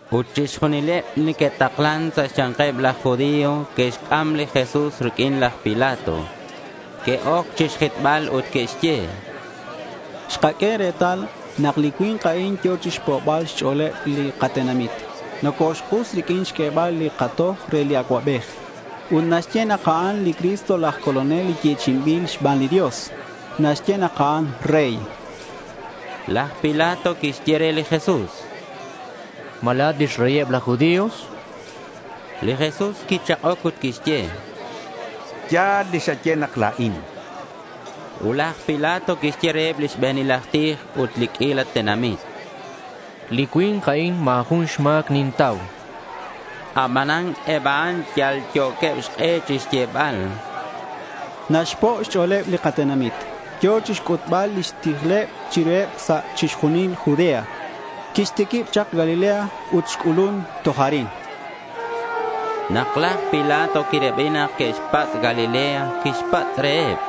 Ut chixjunileb li neque'taklan sa' xya̱nkeb laj judío que'xc'am li Jesús riq'uin laj Pilato. Que'oc chixjitbal ut que'xye: —Xkaq'ue retal nak li cui̱nk a'in yo̱ chixpo'bal xch'o̱leb li katenamit. Nocoxk'us riq'uin xq'uebal li katoj re li acuabej. Ut naxye nak a'an li Cristo laj Colonel li yechi'inbil xban li Dios. Naxye nak a'an rey, chanqueb. Laj Pilato quixye re li Jesús: —¿Ma la̱at lix reyeb laj judío? Li Jesús quichak'oc ut quixye: —Ya̱l li xaye nak la̱in, chan. Ut laj Pilato quixye reheb li xbe̱nil aj tij ut eb li q'uila tenamit: —Li cui̱nk a'in ma̱ jun xma̱c nintau, chan. Abanan eb a'an yalyo̱queb xk'e chixyebal: —Naxpo' xch'o̱leb li katenamit. Yo̱ chixc'utbal lix tijleb chiruheb sa' chixjunil Judea. Quixtiquib chak Galilea ut xc'ulun toj arin, chanqueb. Nak laj Pilato quirabi nak que'xpatz' Galilea, quixpatz' reheb: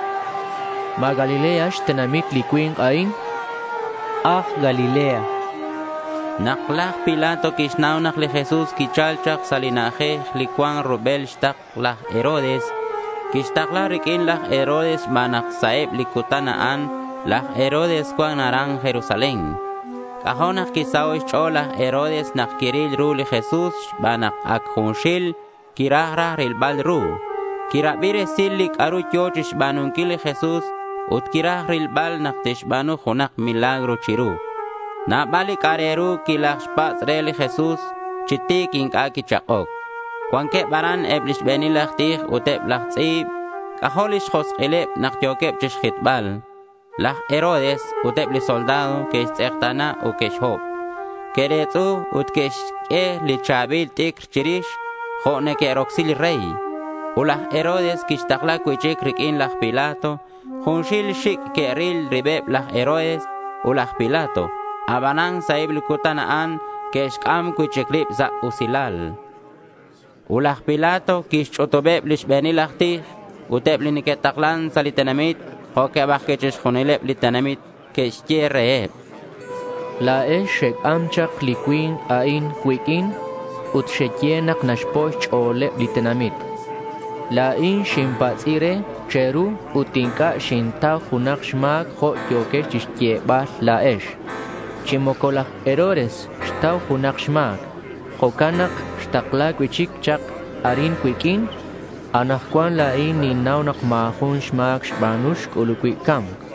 —¿Ma Galilea xtenamit li cui̱nk a'in? chan reheb. —Aj Galilea, chanqueb re. Nak laj Pilato quixnau nak li Jesús quichal chak sa' li na'ajej li cuan rubel xtakl laj Herodes, quixtakla riq'uin laj Herodes xban nak sa' eb li cutan a'an laj Herodes cuan aran Jerusalén. C'ajo' nak quisaho' xch'o̱l laj Herodes nak quiril ru li Jesús xban nak ac junxil quiraj raj rilbal ru. Quirabi resil li c'a'ru yo̱ chixba̱nunquil li Jesús ut quiraj rilbal nak tixba̱nu junak milagro chiru. Nabal li c'a'ak re ru quilajxpatz' re ut li Jesús chi ti̱c inc'a' quichak'oc. Cuanqueb aran eb li xbe̱nil aj tij ut eb laj tz'i̱b. C'ajo' lix josk'ileb nak yo̱queb chixjitbal. Laj Herodes ut eb li soldado que'xtz'ekta̱na ut que'xhob. Que'retz'u ut que'xq'ue li cha̱bil t'icr chirix jo' neque'rocsi li rey. Ut laj Herodes quixtakla cui'chic riq'uin laj Pilato. Junxil xic' que'ril ribeb laj Herodes ut laj Pilato. Abanan sa' eb li cutan a'an que'xc'am cui'chic rib sa' usilal. Ut laj Pilato quixch'utubeb li xbe̱nil laj tij, ut eb li neque'taklan sa' li tenamit jo'queb ajcui' chixjunileb li tenamit. Quixye reheb: —La̱ex xec'am chak li cui̱nk a'in cuiq'uin ut xeye nak naxpo' xch'o̱leb li tenamit. La̱in xinpatz'i re che̱ru ut inc'a' xintau junak xma̱c jo' yo̱quex chixyebal la̱ex. Chi moco laj Herodes xtau junak xma̱c. Jo'can nak xtakla cui'chic chak arin cuiq'uin. Anakcuan la̱in ninnau nak ma̱ jun ma̱c xba̱nu xc'ulub cui' ca̱mc.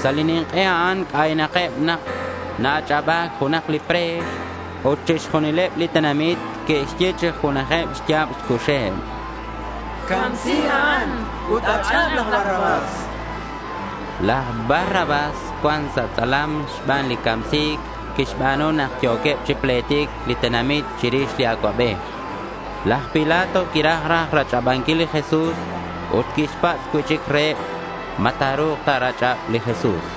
Sa' li nink'e a'an c'aynakeb nak na-ach'aba̱c junak li pre̱x. Ut chixjunileb li tenamit que'xye chi junajeb xya̱b xcuxeb: —¡Camsi a'an, ut ach'ab laj Barrabás! chanqueb. Laj Barrabás cuan sa' tz'alam xban li camsi̱nc quixba̱nu nak yo̱queb chi pletic li tenamit chirix li acuabej. Laj Pilato quiraj raj rach'abanquil li Jesús ut quixpatz' cui'chic reheb ma ta̱ru̱k ta̱rach'ab li Jesús.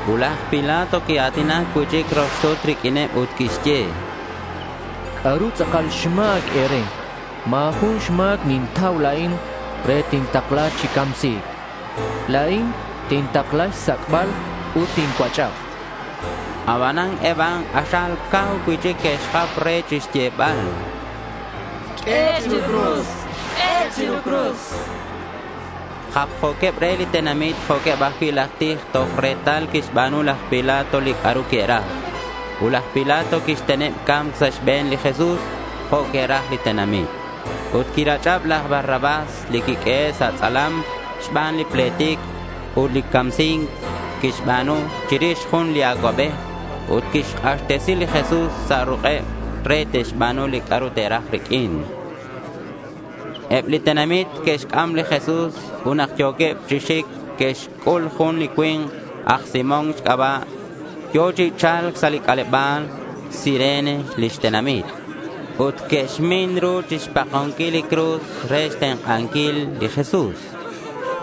Ut laj Pilato quia̱tinac cui'chic rox sut riq'uineb ut quixye: —¿C'a'ru tz'akal xma̱c e̱re? Ma̱ jun xma̱c nintau la̱in re nak tintakla chi camsi̱c. La̱in tintakla xsac'bal ut tincuach'ab, chan reheb. Abanan eb a'an k'axal cau cui'chic que'xjap re chixyebal: —¡Q'ue chiru cruz!— Japjo̱queb re li tenamit jo' eb ajcui' laj tij toj retal quixba̱nu laj Pilato li c'a'ru que'raj. Ut laj Pilato quixteneb ca̱mc sa' xbe̱n li Jesús jo' que'raj li tenamit. Ut quirach'ab laj Barrabás li quiq'uehe' sa' tz'alam xban li pletic ut camsi̱nc quixba̱nu chirix jun li acuabej. Ut quixk'axtesi li Jesús sa' ruk'eb re te'xba̱nu li c'a'ru te'raj riq'uin. Eb li tenamit que'xc'am li Jesús ut nak yo̱queb chi xic que'xc'ul jun li cui̱nk aj Simón xc'aba' yo̱ chi cha̱lc sa' c'aleba̱l. Cirene lix tenamit. Ut que'xmin ru chixpakonquil li cruz re xtenk'anquil li Jesús.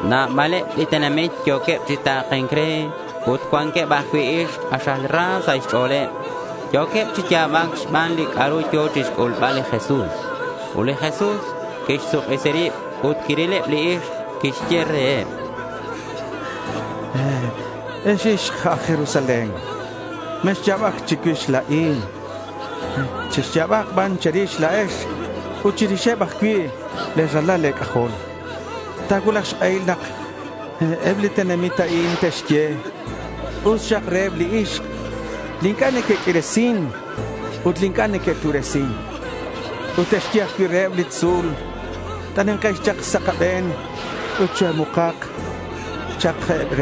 Nabaleb li tenamit yo̱queb chi ta̱ke̱nc re. Ut cuanqueb ajcui' ixk k'axal ra sa' xch'o̱leb. Yo̱queb chi ya̱bac xban li c'a'ru yo̱ chixc'ulbal li Jesús. Ut li Jesús quixsuk'isi rib ut quirileb li ixk. Quixye reheb: —Ex ixk aj Jerusalén, mexya̱bac chicuix la̱in. Chexya̱bak ban che̱rix la̱ex ut chirixeb ajcui' le̱ ralal e̱c'ajol. Ta̱cuulak xk'ehil nak eb li tenamit a'in te'xye, “Us xak reheb li ixk li inc'a' neque'q'uiresin ut li inc'a' neque'tu'resin.” Ut te'xye ajcui' reheb li tzu̱l, “T'anekex chak sa' kabe̱n ut choe̱muk taxak”, cha'keb.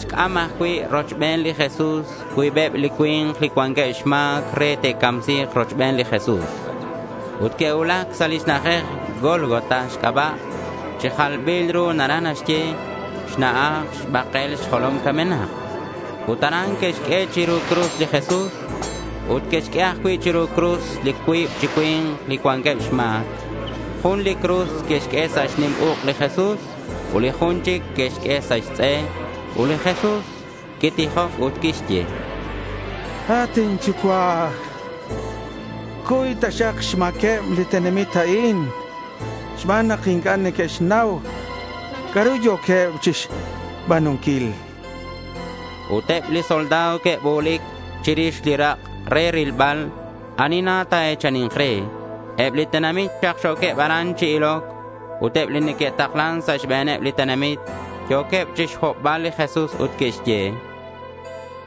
Que'xc'am ajcui' rochben li Jesús cuibeb li cui̱nk li cuanqueb xma̱c re te'camsi̱k rochben li Jesús. Ut que'cuulac sa' li na'ajej Gólgota xc'aba'. Chi jalbil ru naraj naxye: Xna'aj Xbakel Xjolom Camenak. Ut aran que'xq'ue chiru cruz li Jesús. Ut que'xq'ue ajcui' chiru cruz li cuib chi cui̱nk li cuanqueb xma̱c. Jun li cruz que'xq'ue sa' xnim uk' li Jesús ut li jun chic que'xq'ue sa' xtz'e. Ut li Jesús quitijoc ut quixye: —At inYucua', cuy taxak xma̱queb li tenamit a'in xban nak inc'a' neque'xnau c'a'ru yo̱queb chixba̱nunquil, chan. Ut eb li soldado que'bu̱lic chirix li rak' re rilbal ani na ta̱e̱chani̱nk re. Eb li tenamit xakxo̱queb aran chi iloc. Ut eb li neque'taklan sa' xbe̱neb li tenamit yo̱queb chixhobbal li Jesús ut que'xye: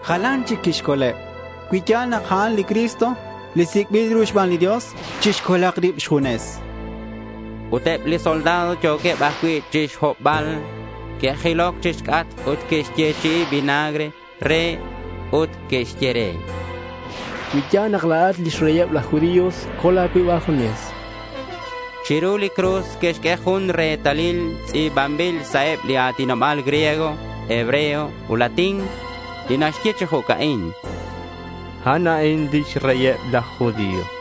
—Jalan chic quixcoleb. Cui ya̱l nak a'an li Cristo, li sic'bil ru xban li Dios, chixcolak rib xjunes, chanqueb. Ut eb li soldado yo̱queb ajcui' chixhobbal. Que'jiloc chixc'atk ut que'xyechi'i vinagre re. Ut que'xye re: —Cui ya̱l nak la̱at lix reyeb laj judío, col a̱cuib a̱junes, chanqueb. Chiru li cruz que'xq'ue jun retalil tz'i̱banbil sa' eb li a̱tinoba̱l griego, hebreo, ut latín, li naxye chi jo'ca'in: A'an a'in lix reyeb laj judío.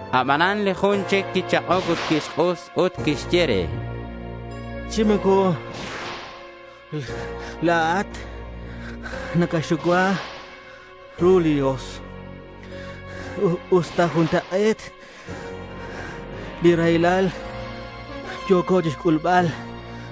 Abanan li jun chic quichak'oc ut quixk'us ut quixye re: —Chi moco la̱at nacaxucua ru li Dios, usta juntak'e̱t li raylal li yo̱co chixc'ulbal kochben a'an.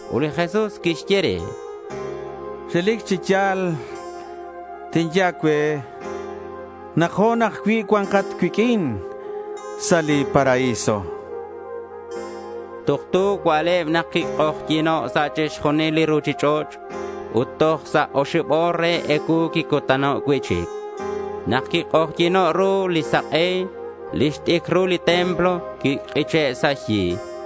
Ut li Jesús quixye re: —Relic chi ya̱l tinye a̱cue nak ho̱n ajcui' cua̱nkat cuiq'uin sa' li paraíso, chan re. Tuktu cua'leb quik'ojyi̱no' sa' chixjunil li ruchich'och' ut toj sa' oxib o̱r re ecuu quicutano' cui'chic. Nak quik'ojyi̱no' ru li sak'e, lix t'icrul li templo quik'iche' sa' xyi.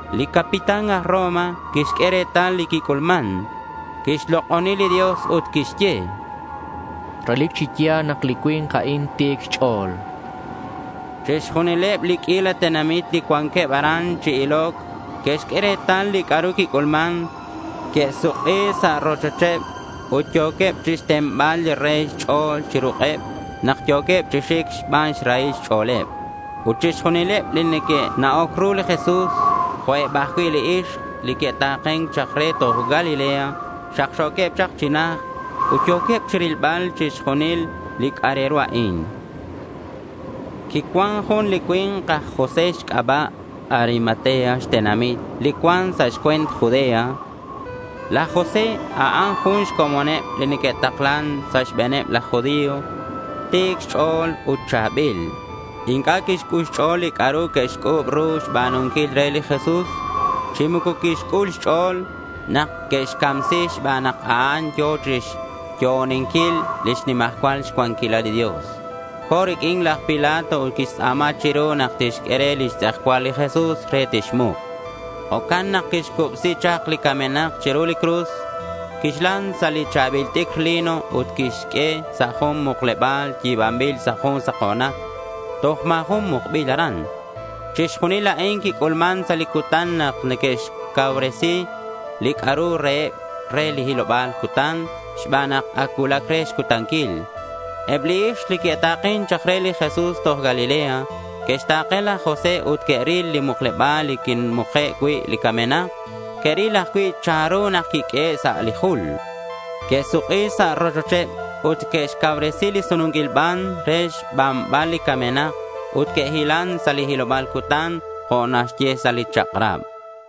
Li capitán aj Roma quixq'ue retal li quic'ulman. Quixlok'oni li Dios ut quixye: —Relic chi ya̱l nak li cui̱nk a'in ti̱c xch'o̱l, chan. Chixjunileb li q'uila tenamit li cuanqueb aran chi iloc, que'xq'ue retal li c'a'ru quic'ulman. Que'suk'i sa' rochocheb ut yo̱queb chixtenbal li re xch'o̱l chi ruk'eb nak yo̱queb chi xic xban xrahil xch'o̱leb. Ut chixjunileb li neque'na'oc ru li Jesús, jo' eb ajcui' li ixk li que'ta̱ken chak re toj Galilea xakxo̱queb chak chi najt ut yo̱queb chirilbal chixjunil li c'a'ak re ru a'in. Quicuan jun li cui̱nk aj José xc'aba'. Arimatea xtenamit li cuan sa' xcue̱nt Judea. Laj José, a'an jun xcomoneb li neque'taklan sa' xbe̱neb laj judío. Ti̱c xch'o̱l ut cha̱bil. Inc'a' quixc'ul xch'o̱l li c'a'ru que'xc'u̱b ru xba̱nunquil re li Jesús, chi moco quixc'ul xch'o̱l nak que'xcamsi xban nak a'an yo̱ chixyo'oninquil lix nimajcual cuanquilal li Dios. Co̱ riq'uin laj Pilato ut quixtz'a̱ma chiru nak tixq'ue re lix tz'ejcual li Jesús re tixmuk. Jo'can nak quixcubsi chak li camenak chiru cruz, quixlan sa' li cha̱bil t'icr lino ut quixq'ue sa' jun mukleba̱l yi̱banbil sa' jun sako̱nac. Toj ma̱ jun mukbil aran. Chixjunil a'in quic'ulman sa' li cutan nak neque'xcauresi li c'a'ru reheb re li hiloba̱l cutan xban nak ac cuulac re xcutanquil. Eb li ixk, li que'ta̱ken chak re li Jesús toj Galilea, que'xta̱ke laj José ut que'ril li mukleba̱l li quimuke' cui' li camenak ut que'ril ajcui' chanru nak quiq'uehe' sa' li jul. Que'suk'i sa' rochocheb ut que'xcauresi li sununquil ban re xbanbal li camenak, ut que'hilan sa' li hiloba̱l cutan jo' naxye sa' lix chak'rabeb.